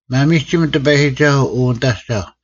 ᒪᒥᒋᒻ ᑎᐸᔨᒋᒐᓱᐤ ᐅ ᓂᑦ ᐊᒐᐧᒄ: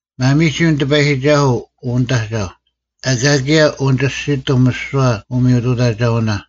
ᒪᒥᒋᒻ ᑎᐸᔨᒋᒐᓱᐤ, ᐅ ᓂᑦ ᐊᒐᐧᒄ: ᐊᑲ ᑭᔭ ᐅᓂᒋᔅᒋᑎᒻ ᒥᓯᐛ ᐅᒥᔪᑐᑕᒐᐅᓇ;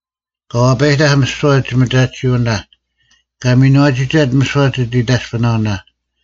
ᑲ ᐛᐸᔨᑕᐧᒄ ᒥᓯᐛ ᒋᒥᒐᑎᓯᐅᓇ; ᑲ ᒥᓏᒋᑕᑦ ᒥᓯᐛ ᒋᑦ ᐃᑕᔅᐱᓇᐅᓇ;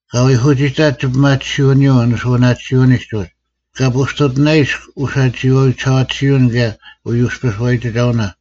ᑲ ᐎᐧᑯᒋᑕᑦ ᒋᐱᒪᑎᓯᐅᓂᔪᐤ ᓂᓱᐅᓇᑎᓯᐅᓂᒡ ᐅᒡ; ᑲ ᐳᔅᑕᔅᑐᑎᓇᐃᔅᒃ ᐅᓴᒋᐃᐛᐎ ᒋᓴᐛᑎᓯᐅᓐ ᑭᔭ ᐅᔪᔅᐱ ᓱᐛᔨᒋᒐᐅᓇ;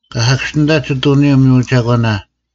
ᑲ ᓴᑭᔅᒋᓂᑕᑦ ᒋᑐᓂᔪᐤ ᒥᔪ ᒐᒂᓇ;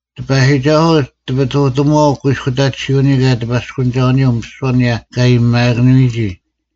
ᑎᐸᔨᒋᒐᓱᐤ ᑎᐱᑐᑎᒪᐛᐤ ᑯᐃᔅᑯᑕᑎᓯᐅᓂᔪᐤ ᑭᔭ ᑎᐸᔅᑯᓂᒐᐅᓂᔪᐤ ᒥᓯᐛ ᐊᓂᔭ ᑲ ᐊᔨᒥᐊᑭᓄᔨᒋ᙮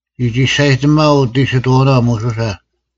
ᒋ ᒋᔅᒐᔨᑎᒥᐊᐤ ᐅᑦ ᐃᓯᑥᐅᓇ ᒧᓱᓴ,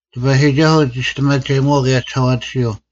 ᑎᐸᔨᒋᒐᓱᐤ ᒋᔅᑎᒪᒐᔨᒧᐛᐤ ᑭᔭ ᒋᓴᐛᑎᓯᐤ,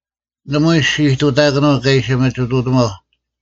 ᓇᒪᐎᔾ ᔅᒋ ᐃᑐᑕᑯᓄᐤ ᑲ ᐃᓯ ᒥᒋᑐᑎᒪᐧᒄ;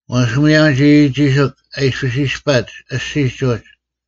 ᐛᔅ ᒧᔭᒻ ᒋᒋᒋᓯᒄ ᐊ ᐃᔅᐱᔅ ᐃᔅᐸᒡ ᐊᔅᒋᔾ ᐅᒡ,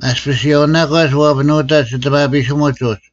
ᐊᔅᐱᔅ ᔭᐅᓇᒂᒡ ᐛᐱᓄᑕᒡ ᐊᑎᒪᐱᓯᒧᒡ ᐅᒡ,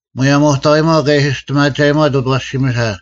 ᒧᔭᒻ ᐅᑕᐎᒪᐤ ᑲ ᐃᓯ ᒋᔅᑎᒪᒐᔨᒪᑦ ᐅᑦ ᐊᐛᓯᒥᓴ;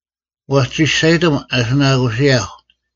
ᐛᔅ ᒋᔅᒐᔨᑎᒻ ᐊᓯᓇᑯᓯᔭᐧᒄ;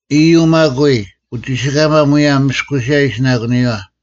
ᐃᔪᐤ ᒪᒃ ᐎᔾ, ᐅᒋᓯᑲᒪ ᒧᔭᒻ ᒥᔅᑯᓯᔭ ᐃᓯᓇᑯᓂᔪᐛ: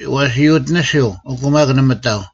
ᐛᔅ ᔪᑎᓂᓯᐤ, ᐊᑯ ᒪᒃ ᓇᒪ ᑕᐤ,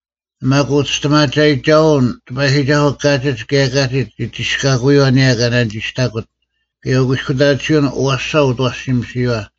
ᒪᒃ ᐅᒋᔅᑎᒪᒐᔨᒋᒐᐅᓐ ᑎᐸᔨᒋᒐᓱᐤ ᑲᒋᒡ ᑭᔭ ᑲᒋᒡ ᒋᒋᔅᑲᑯᔪᐛ ᐊᓂᔭᔪᐛ ᑲ ᓇᓂᒋᔅᑕᑯᑦ, ᑭᔭ ᐅᑯᐃᔅᑯᑕᑎᓯᐅᓐ ᐊᐛᓴ ᐅᑦ ᐊᐛᓯᒥᓯᔪᐛ;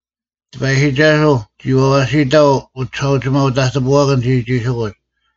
ᑎᐸᔨᒋᒐᓱᐤ ᒋ ᐊᐛᓯᑕᐤ ᐅᒋᓴᐅᒋᒪᐅ-ᑕᑎᐳᐛᑭᓐ ᒋᒋᒋᓯᑯᒡ;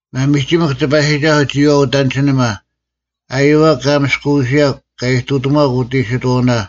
ᒪᒥᒋᒥᐧᒄ ᑎᐸᔨᒋᒐᓱᐤ, ᒋᔨᐛᐤ ᐅᑦ ᐊᓐᒋᓂᒪ! ᐊᔪᐛᒃ ᑲ ᒥᔅᑯᐅᓯᔭᒄ, ᑲ ᐃᑐᑎᒺᒄ ᐅᑦ ᐃᑎᓱᐛᐅᓇ,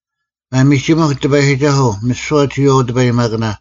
ᒪᒥᒋᒥᐧᒄ ᑎᐸᔨᒋᒐᓱᐤ, ᒥᓯᐛ ᒋᔨᐛᐤ ᐅᑎᐸᔨᒪᑭᓇ;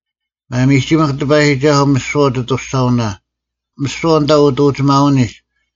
ᒪᒥᒋᒥᐧᒄ ᑎᐸᔨᒋᒐᓱᐤ, ᒥᓯᐛ ᐅᑦ ᐊᑐᔅᒐᐅᓇ, ᒥᓯᐛ ᐊᓐᑕ ᐅᑦ ᐅᒋᒪᐅᓂᒡ: